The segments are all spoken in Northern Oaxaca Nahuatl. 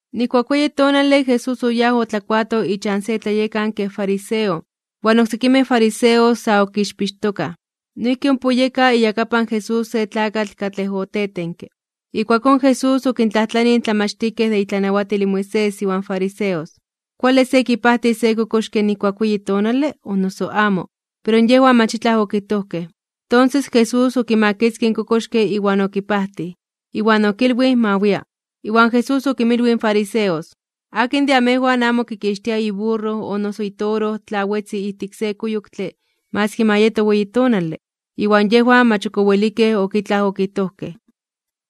Nijkuak weyi tonale Jesús oyáj otlakuato ichan se tlayekanke fariseo, iwan oksekimej fariseos sa okixpixtokaj. Noijki ompa oyeka iyakapan Jesús se tlakatl katlej otetenke. Ijkuakón Jesús okintlajtlanij in tlamachtijkej de itlanawatil in Moisés iwan fariseos: ―¿Kuale se kipajtis se kokoxke nijkuak weyi tonale, o noso amo? Pero yejwan mach itlaj okijtojkej. Tonses Jesús okimakitzkij in kokoxke iwan okipajtij, iwan okilwij ma wia. Iwan Jesús okinmilwij in fariseos: ―¿Akin de amejwan amo kikixtia iburro o noso itoro tla wetzi ijtik se kuyoktle maski ma yeto weyi tonale? Iwan yejwan mach ok owelikej ok itlaj okijtojkej.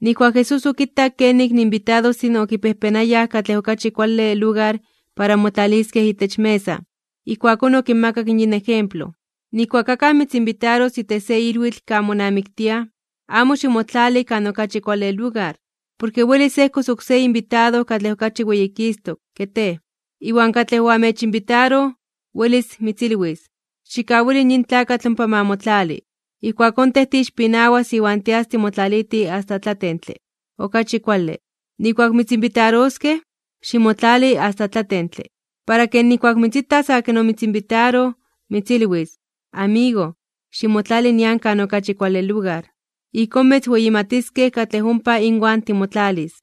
Nijkuak Jesús okitak kenik in inbitadostin okipejpenayaj katlej okachi kuale lugar para motlaliskej itech mesa, ijkuakón okinmakak yin ejemplo: ―Nijkuak akaj mitzinbitaros itech se ilwitl kan monamiktiaj, amo ximotlali kan okachi kuale lugar, porke welis ejkos oksé inbitado katlej okachi weyikistok (weyititos) ke tej. Iwan katlej oamechinbitaroj, welis mitzilwis: “Xikkawili yin tlakatl ompa ma motlali.” Ijkuakón tej tiixpinawas iwan tias timotlaliti asta tlatentle. Okachi kuale, nijkuak mitzinbitaroskej, ximotlali asta tlatentle. Para ke nijkuak mitzitas akin omitzinbitaroj, mitzilwis: “Amigo, ximotlali nian kan okachi kuale lugar.” Ijkón mitzweyimatiskej katlej ompa inwan timotlalis.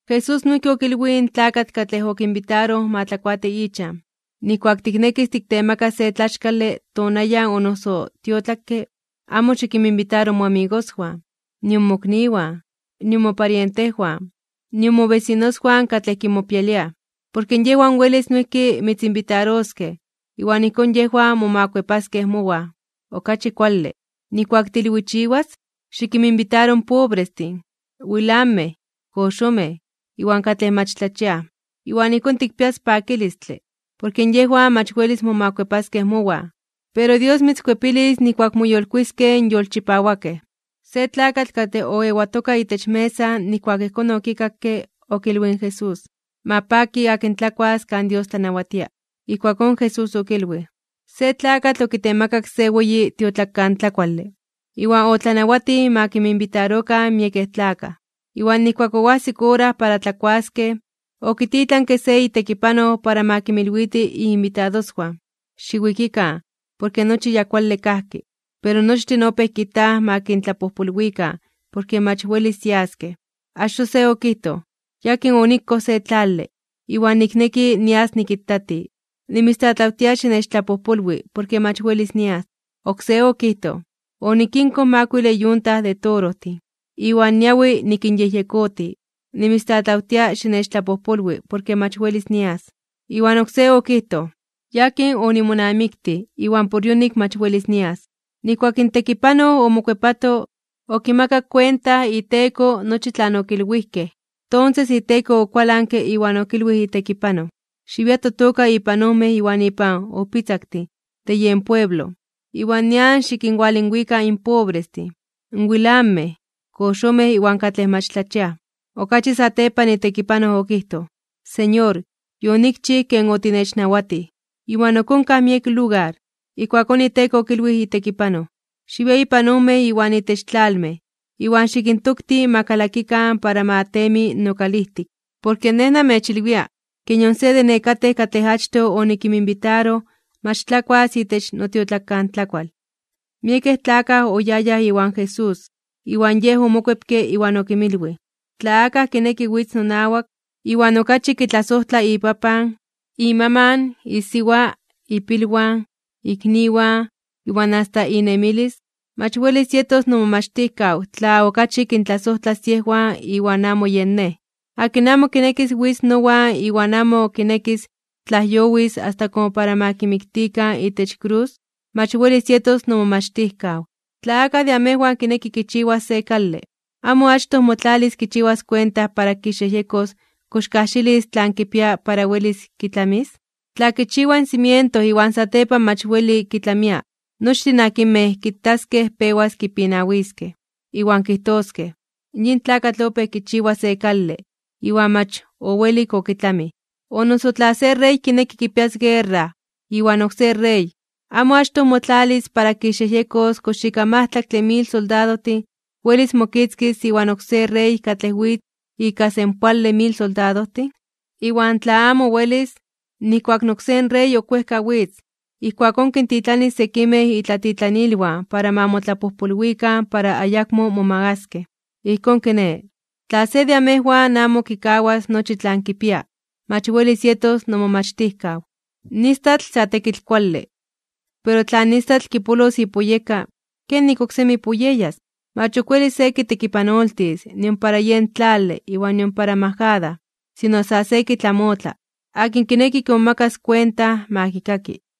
Jesús noijki okilwij in tlakatl katlej okinbitaroj ma tlakuati ichan: ―Nijkuak tiknekis tiktemakas se tlaxkale tonayan o noso tiotlakke, amo xikinminbitaro moamigoswan, nion mokniwan, nion moparientejwan, nion mobesinoswan katlej kimopialiaj. Porke yejwan welis noijki mitzinbitaroskej, iwan ijkón yejwan momakuepaskej mowan. Okachi kuale, nijkuak tiilwichiwas, xikinminbitaro in pobrestin, wilanmej (temetlamej), koxomej, iwan katlej mach tlachiaj. Iwan ijkón tikpias pakilistle. Porke yejwan mach welis momakuepaskej mowan, pero Dios mitzkuepilis nijkuak moyolkuiskej (moyolitiskej) in yolchipawakej. Se tlakatl katlej oewatoka itech mesa nijkuak ijkón okikakke, okilwij in Jesús: ―Ma paki akin tlakuas kan Dios tlanawatia. Ijkuakón Jesús okilwij: ―Se tlakatl okitemakak se weyi tiotlakantlakuale, iwan otlanawatij ma kinminbitarokan miekej tlakaj. Iwan nijkuak oajsik ora para tlakuaskej, okititlanke se itekipanoj ma kinmilwiti iinbitadoswan: “Xiwikikan, porke nochi ya kuale kajki.” Pero nochtin opéj kijtaj ma kintlapojpolwikan porke mach welis yaskej. Achtoj se okijtoj: “Yakin onikoj se tlale, iwan nikneki nias nikitati. Nimitztlatlawtia xinechtlapojpolwi porke mach welis nias.” Oksé okijtoj: “Onikinkoj makuile yunta de torojtin, iwan niawi nikinyejyekoti. Nimitztlatlawtia xinechtlapojpolwi porke mach welis nias.” Iwan oksé okijtoj: “Yakin onimonamiktij, iwan por yonik mach welis nias.” Nijkuak in tekipanoj omokuepato, okimakak kuenta iteko nochi tlan okilwijkej. Tonses iteko okualanke iwan okilwij itekipanoj: “Xiwia totoka ipan ojmej iwan ipan ojpitzaktin de yen pueblo, iwan nian xikinwalinwika in pobrestin, wilanmej (temetlamej), koxomej iwan katlej mach tlachiaj.” Okachi satepan itekipanoj okijtoj: “Señor, yonikchij ken otinechnawatij, iwan ok onkaj miek lugar.” Ijkuakón iteko okilwij itekipanoj: “Xiwia ipan ojmej iwan itech tlalmej, iwan xikintokti ma kalakikan para ma temi nokalijtik. Porke Nej namechilwia ke nion se de nekatej katlej achtoj onikinminbitaroj mach tlakuas itech notiotlakantlakual.” Miekej tlakaj oyayaj iwan Jesús. Iwan Yej omokuepke iwan okinmilwij: ―Tla akaj kineki witz nowan, iwan okachi kitlasojtlas ipapan, imaman, isiwa, ipilwan, ikniwan iwan asta inemilis, mach welis yetos nomomachtijkaw tla okachi kintlasojtlas yejwan iwan amo yen Nej. Akin amo kinekis witz nowan iwan amo kinekis tlajyowis asta komo para ma kimiktikan itech krus, mach welis yetos nomomachtijkaw. Tla akaj de amejwan kineki kichiwas se kale, ¿amo achtoj motlalis kichiwas kuenta para kixyejyekos kox kajxilis tlan kipia para welis kitlamis? Tla kichiwa in cimiento iwan satepan mach weli kitlamia, nochtin akinmej kitaskej pewas kipinawiskej iwan kijtoskej: “Yin tlakatl opéj kichiwa se kale, iwan mach owelik okitlamij.” O noso tla se rey kineki kipias guerra iwan oksé rey, ¿amo achtoj motlalis para kixyejyekos kox ika majtlaktle mil soldadojtin welis mokitzkis iwan oksé rey katlej witz ika senpoale mil soldadojtin? Iwan tla amo welis, nijkuak in oksé rey ok wejka witz, ijkuakón kintitlanilis sekimej itlatitlanilwan para ma motlapojpolwikan para ayakmo momagaskej. Ijkón kiné, tla se de amejwan amo kikawas nochi tlan kipia, mach welis yetos nomomachtijkaw. ’In istatl sa tekitl kuale, pero tla in istatl kipolos ipuyeka, ¿kenik oksemi puyeyas? Mach ok welis se kitekipanoltis nion para yen tlale iwan nion para majada, sino sa se kitlamotla. Akin kineki kimomakas kuenta, ma kikaki.